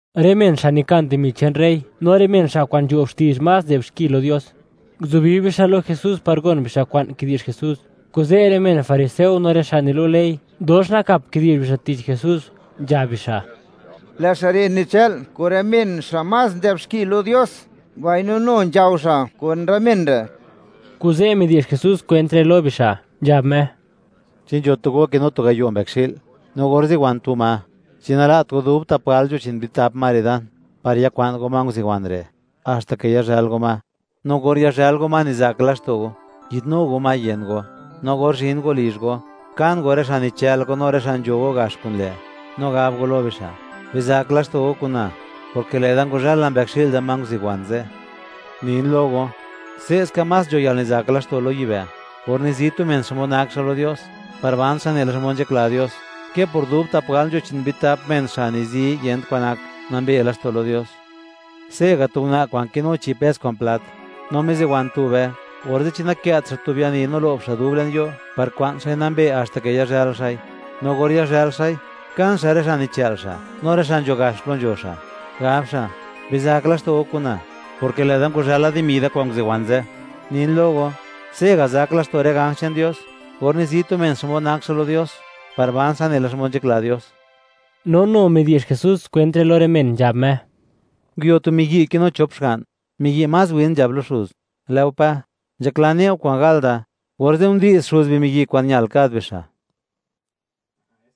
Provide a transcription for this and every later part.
Rë men xa' nikan dimi che'n rey, no rë men xa' kwa'n nzho'b xti'zh más nzë'b xki lo Dios, nguzubi bixa' lo Jesús par gon bixa' kwa'n kidi'zh Jesús. Kuze' rë men fariseo no rë xa' nilu' ley, dox nakap kidi'zh bixa' tich Jesús, nzhab bixa': ―Lë' xa' re' nichë'l kun rë men xa' más nzë'b xki lo Dios, mbaino nu nzhao xa' kun rë men re'. Kuze' midi'zh Jesús kwent re' lo bixa', nzhab Me: ―Chi nzho tu go kinu tu gayo' mbëkxi'l, no or ziwan tu ma, ¿chi nala't go dub tap gal nzho chi'n bitap ma re' dan, par yakwa'n go ma nguziwan re', haxta ke yazhël go ma? No or yazhël go ma, nizak laxto' go, yi'dnu go ma yën go; no or zhin go lizh go, kan go rë xa' nichë'l go, no rë xa' nzho go gax kun lë', no gab go lo bixa': “Bizak laxto' go kuna; porke lë'da ngwazhël la mbëkxi'l da ma nguziwan ze'.” Nin lo go, se'ska más nzho yalnizak laxto' lo yibë', or nizi tu men xmod nak xa' lo Dios, par ban xa' nela xmod nzhakla Dios, ke por dub tap gal nzho chi'n bitap men xa' nizi, yent kwan nak, nambe laxto' lo Dios. ’Se'ga' tu una' kwa'n kinu chi' pes kwa'n plat, no miziwan tube, orze', ¿chi nakë't xa' tu biani, no lo'b xa' dub le'n yo', par kwa'n xa'i nambe, haxta ke yazhël xa'i? No or yazhël xa'i, kan xa' rë xa' nichë'l xa', no rë xa' nzho gax plo nzho xa', gab xa': “Bizak laxto' go kun na, porke lë'da ngwazhël la dimi da, kwa'n nguziwan ze'.” Nin lo go, se'ga' nizak laxto' rë ganj che'n Dios, or nizi tu men xmod nak xa' lo Dios, par ban xa' nela xmod nzhakla Dios. No nu midi'zh Jesús kwent re' lo rë men, nzhab Me: ―Nguio tu miyi', kinu chop xga'n, miyi' más win nzhab lo xuz: “Lë'o Pa, nzhaklan ne'u kwa'n gal da.” Orze' ndi'z xuz bimiyi' kwa'n ñal kad bixa'.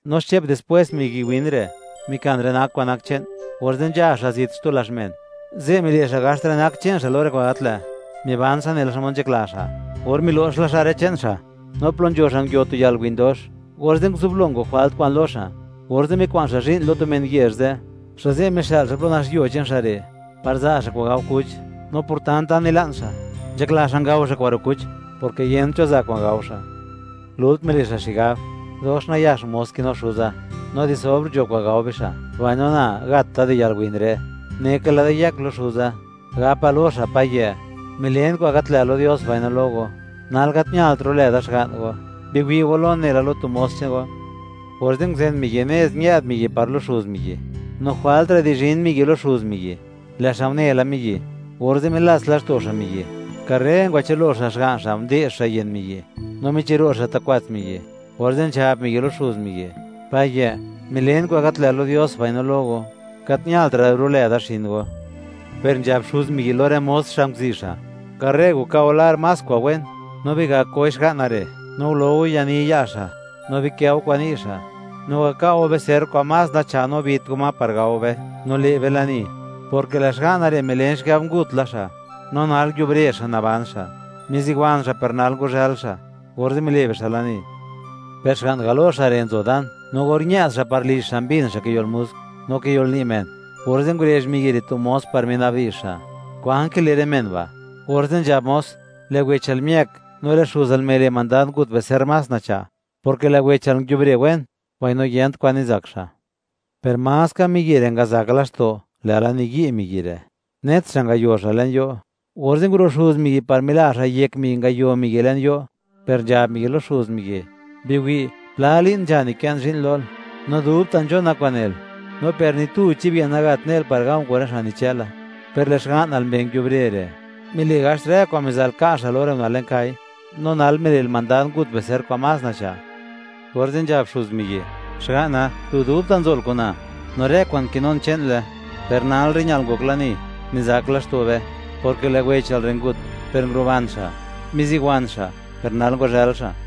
No xche'p dispwés, miyi' win re', mikan rë nak kwa'n nak che'n, orze' nzha xa' zit xtu lazh men. Ze' mile' xa' gaxt rë nak che'n xa' lo rë kwa'n gat lë', miban xa' nela xmod nzhakla xa'. Or milo'x la xa' rë che'n xa', no plo nzho xa' nguio tu yalwin dox, orze' nguzublo ngok jwalt kwa'n lo xa'. Orze' mikwa'n xa' zhi'n lo tu men yezh ze', xa' ze' mixë'l xa' plo nax yuo che'n xa' re', par za' xa' kwa'n gao kuch. No por tanta nila'n xa', nzhakla xa' ngao xa' kwa'n ro' kuch, porke yent cho za' kwa'n gao xa'. Lult mile' xa' xigab: “¡Dox nayax mos kinu xuza, no di sobr nzho kwa'n gao bixa', mbaino na, gat da di yalwin re'! Neka lë'da yëk lo xuza, gapa lo xa': Payë', milen kwa'n gat lë' lo Dios mbaino lo go. Nal gat ñalt ro'lë da xga'n go; biwi' go lon nela lo tu mos che'n go.” Orze' nguzen miyi' nez, ñë'd miyi' par lo xuz miyi'. ’No jwaltra' di zhin miyi' lo xuz miyi', lë' xa' une la miyi'. Orze' milats laxto' xa' miyi', karre ngwachë'lo xa' xga'n xa', nde'x xa' yën miyi', no michiro' xa' ta' kwats miyi'. Orze' nzhab miyi' lo xuz miyi': “Payë', milen kwa'n gat lë' lo Dios, mbaino lo go, gat ñaltra' da ro'lë da xin go.” Per nzhab xuz miyi' lo rë mos xa' nguzi' xa': “Karre waka' go lar más kwa'n wen, no bigak goi xga'na re', no ngulo go yani ya' xa', no bikë' go kwa'n ni' xa', no waka' go bicerr kwa'n más nacha', no bit go ma par gao be, no le' be lani, porke lë' xga'na re', milen xigab ngut la xa', no nal, nguiubre xa' naban xa'; miziwan xa', per nal ngwazhël xa'.” Orze' mile' bixa' lani. ’Per xga'n galo xa' re' nzo dan, no or ñë'd xa' par lizh xa', mbin xa' kiyo'l musk, no kiyolni' men, orze' ngurezh miyi' re' tu mos, par minabdi'zh xa': “¿Kwan kile' rë men ba'?” Orze' nzhab mos: “Lë' wechal miëk, no lë' xuzal mile' mandad ngut bicerr más nacha', porke lë' wechal nguiubre wen, mbaino yent kwa'n nizak xa'.” Per maska miyi' re' ngazak laxto', lë'la niyi' miyi' re', net xa' ngayo xa' le'n yo'. Orze' nguro' xuz miyi', par mila xa' yek miyi' ngayo miyi' le'n yo', per nzhab miyi' lo xuz miyi': “Biwi', pla li'n nzha nikën zhi'n lol, no dubta' nzhona kwa'n nel, no per ni tu chib ye'n gat ne'l par ga̱u̱ kun rë xa' nichëla, per lë' xga'nal mbee' nguiubre re', mile' gaxt rë kwa'n miza'l ka' xa', lo rë una' le'n kai (kwa' gal), ¡no nal mile'l mandad, ngut bicerr kwa'n más nacha'!” Orze' nzhab xuz miyi': “Xga'na, lu dubta' nzol kun na; no rë kwa'n kinun, che'nle. Per nalre', ñal ngok lani, nizak laxto' be, porke lë' wechal re' ngut, per nguruban xa'; miziwan xa', per nal, ngwazhël xa'.”